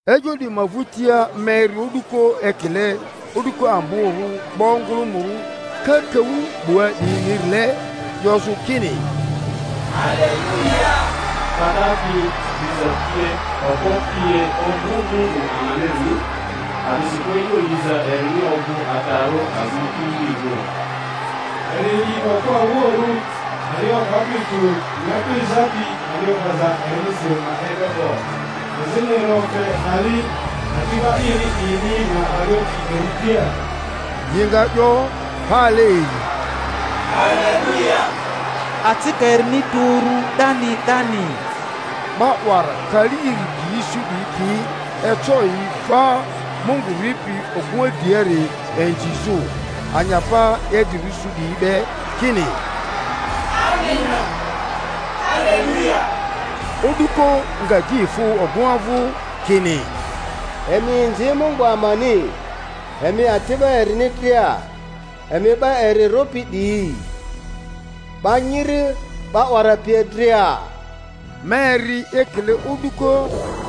E'yo 'diyi ma vᴜtia ma eri o'duko ekile o'duko amborᴜ 'ba ongᴜlᴜmᴜrᴜ kakaᴜ 'bua 'diyinirile, 'yozᴜ kini, Haleluya! Pata pi, diza pie, okpo pie ovᴜ Mungu amanirini, a'disikᴜ e'yo liza erini ovᴜ adarᴜ azini kililirᴜ; eri li okᴜ awuoᴜrᴜ ali o'bapi tᴜ nyaku ezapi ali o'baza erinisiri ma e'yo 'bo, azini eri ofe ari ati'ba ini 'diyini ma arioti eri dria. Yi nga 'yo pale iri, Haleluya! Acika erini tu uru 'dani 'dani. 'Ba 'wara kali iri drini su 'diyi pi eco yi va Mungu ripi ogᴜŋa driari inzizᴜ, anyapa idrirᴜ su 'diyi be, kini, Amena. Haleluya! O'duko nga di efᴜ ogᴜŋa vᴜ, kini, Emi inzi Mungu amani, emi ati'ba erini dria, emi 'ba eri rᴜpi 'diyi, 'ba nyiri 'ba 'wara pie dria. Ma eri ekile o'duko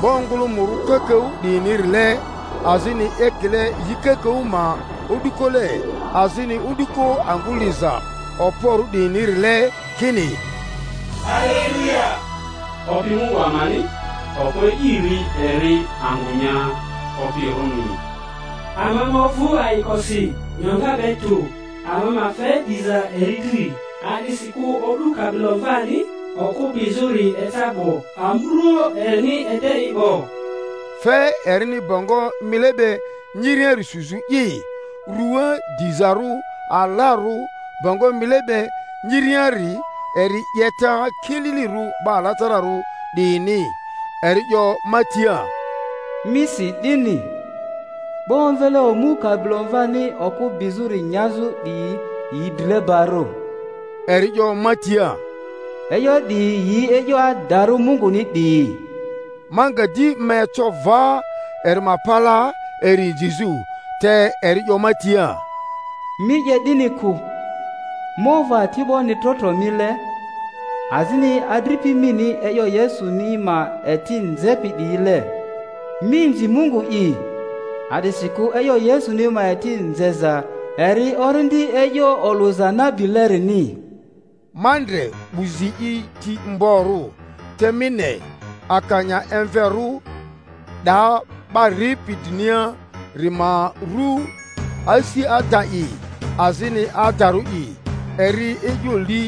'ba ongᴜlᴜmᴜrᴜ kakaᴜ 'diyinirile, azini ekile yi kakaᴜ ma o'dukole, azini o'duko angᴜ liza okporᴜ 'diyinirile, kini, Haleluya! Opi Mungu amani, Okpo E'iri eri angᴜ nya opirᴜni. Ama ma ovᴜ ayikosi, nyoŋa be tᴜ, ama ma fe diza eri dri, a'disikᴜ o'du Kabilomvani okᴜ bizᴜri eca 'bo, amurᴜoᴜ erini ede i 'bo; fe erini bongo mile be nyiriari suzᴜ i ruaa dizarᴜ, alarᴜ— bongo mile be nyiriari eri 'yeta kililirᴜ 'ba alatararᴜ 'diyini. Eri 'yo ma tia, Mi si 'dini, 'Ba omvele omu Kabilomvani okᴜ bizᴜri nyazᴜ 'diyi yi drilebarᴜ. Eri 'yo ma tia, E'yo 'diyi yi e'yo adarᴜ Munguni 'diyi. Ma nga di ma eco va eri ma palaa eri inzizᴜ, te eri 'yo ma tia, Mi 'ye 'dini kᴜ! Ma ovᴜ ati'boni trotro mile, azini adripi mini e'yo Yesuni ma eti nzepi 'diyile. Mi inzi Mungu'i. A'disikᴜ e'yo Yesuni ma eti nzeza eri orindi e'yo olᴜza nabilerini. Ma ndre 'bu zi i ti mgborᴜ, te mi ne, akanya emverᴜ! 'Da 'ba ripi driniari ma ru Asi Ada'i azini Adarᴜ'i; eri e'yo li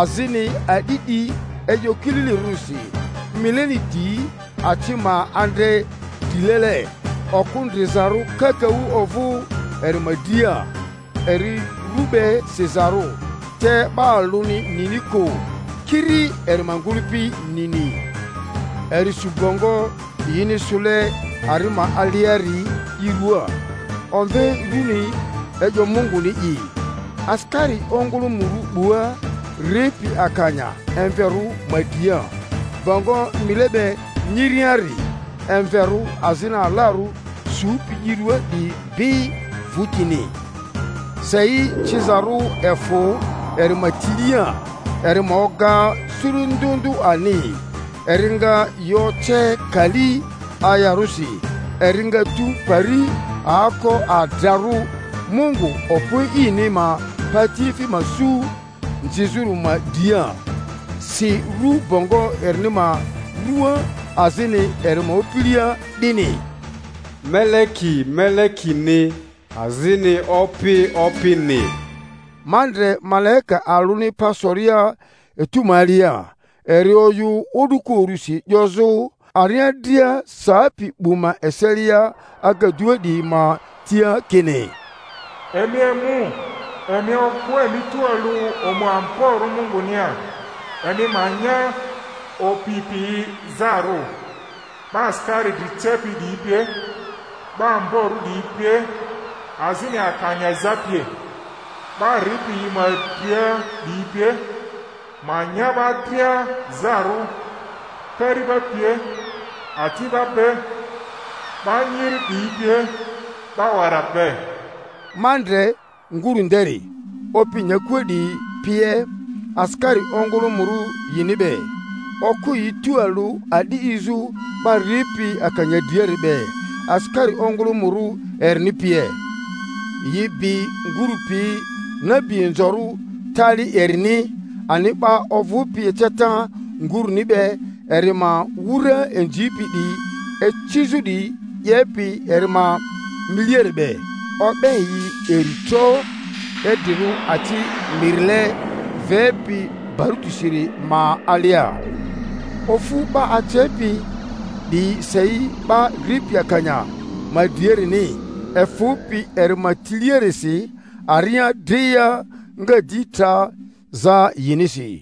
azini a'di 'di e'yo kililirᴜrisi. Mileni di aci ma andre drilele, oku ndrizarᴜ kakaᴜ ovᴜ eri ma dria; eri ru be sizarᴜ, te 'ba alᴜni nini kᴜ, kiri eri ma ngᴜlᴜpi nini. Eri su bongo yini sᴜle ari ma aliari i ruaa, omve rᴜni E'yo Munguni'i. Asikari ongᴜlᴜmᴜrᴜ 'bua, ripi akanya emverᴜ ma dria, bongo mile be nyiriari emverᴜ azini alarᴜ supi yi rᴜaa 'diyi bi vᴜtini. Sei cizarᴜ efᴜ eri ma tilia, eri ma oga suru ndᴜ ndᴜ ani, eri nga yi oce kali ayarᴜsi; eri nga tᴜ pari aoko adrarᴜ Mungu Okpo E'ini ma patiefi ma su nzizᴜri ma dria. Si ru bongo erini ma ruaa, azini eri ma opilia 'dini, MELEKI MELEKINI AZINI OPI OPINI. Ma ndre malaika alᴜni pa soria etu ma alia, eri oyᴜ o'duko urusi 'yozᴜ aria dria sapi 'bu ma eselia agadua 'diyi ma tia kini, Emi emu, emi okᴜ emi tualᴜ omu amborᴜ Mungunia, emi ma nya opi piyi zarᴜ, 'ba asikari dri cepi 'diyi pie, 'ba ombarᴜ 'diyi pie azini akanya za pie, 'ba ripi yi ma dria 'diyi pie, ma nya 'ba dria zarᴜ, kari'ba pie ati'ba be, 'ba nyiri 'diyi pie, 'ba 'wara be. Ma ndre nguru nderi, opi nyakua 'diyi pie, asikari ongᴜlᴜmᴜrᴜ yini be, okᴜ yi tualᴜ a'di 'dizᴜ 'ba ripi akanya driari be, asikari ongᴜlᴜmᴜrᴜ erini pie. Yi bi ngurᴜ pi nabi inzorᴜ tali erini ani 'ba ovᴜpi eceta nguruni be eri ma wura inzipi 'diyi icizᴜ 'diyi 'yepi eri ma miliari be. O'be yi iri tro idrirᴜ aci mirile vepi barutisiri ma alia. Ofu 'ba acepi 'diyi sei 'ba ripi akanya ma driarini, efᴜpi eri ma tiliarisi; aria dria nga di tra za yinisi.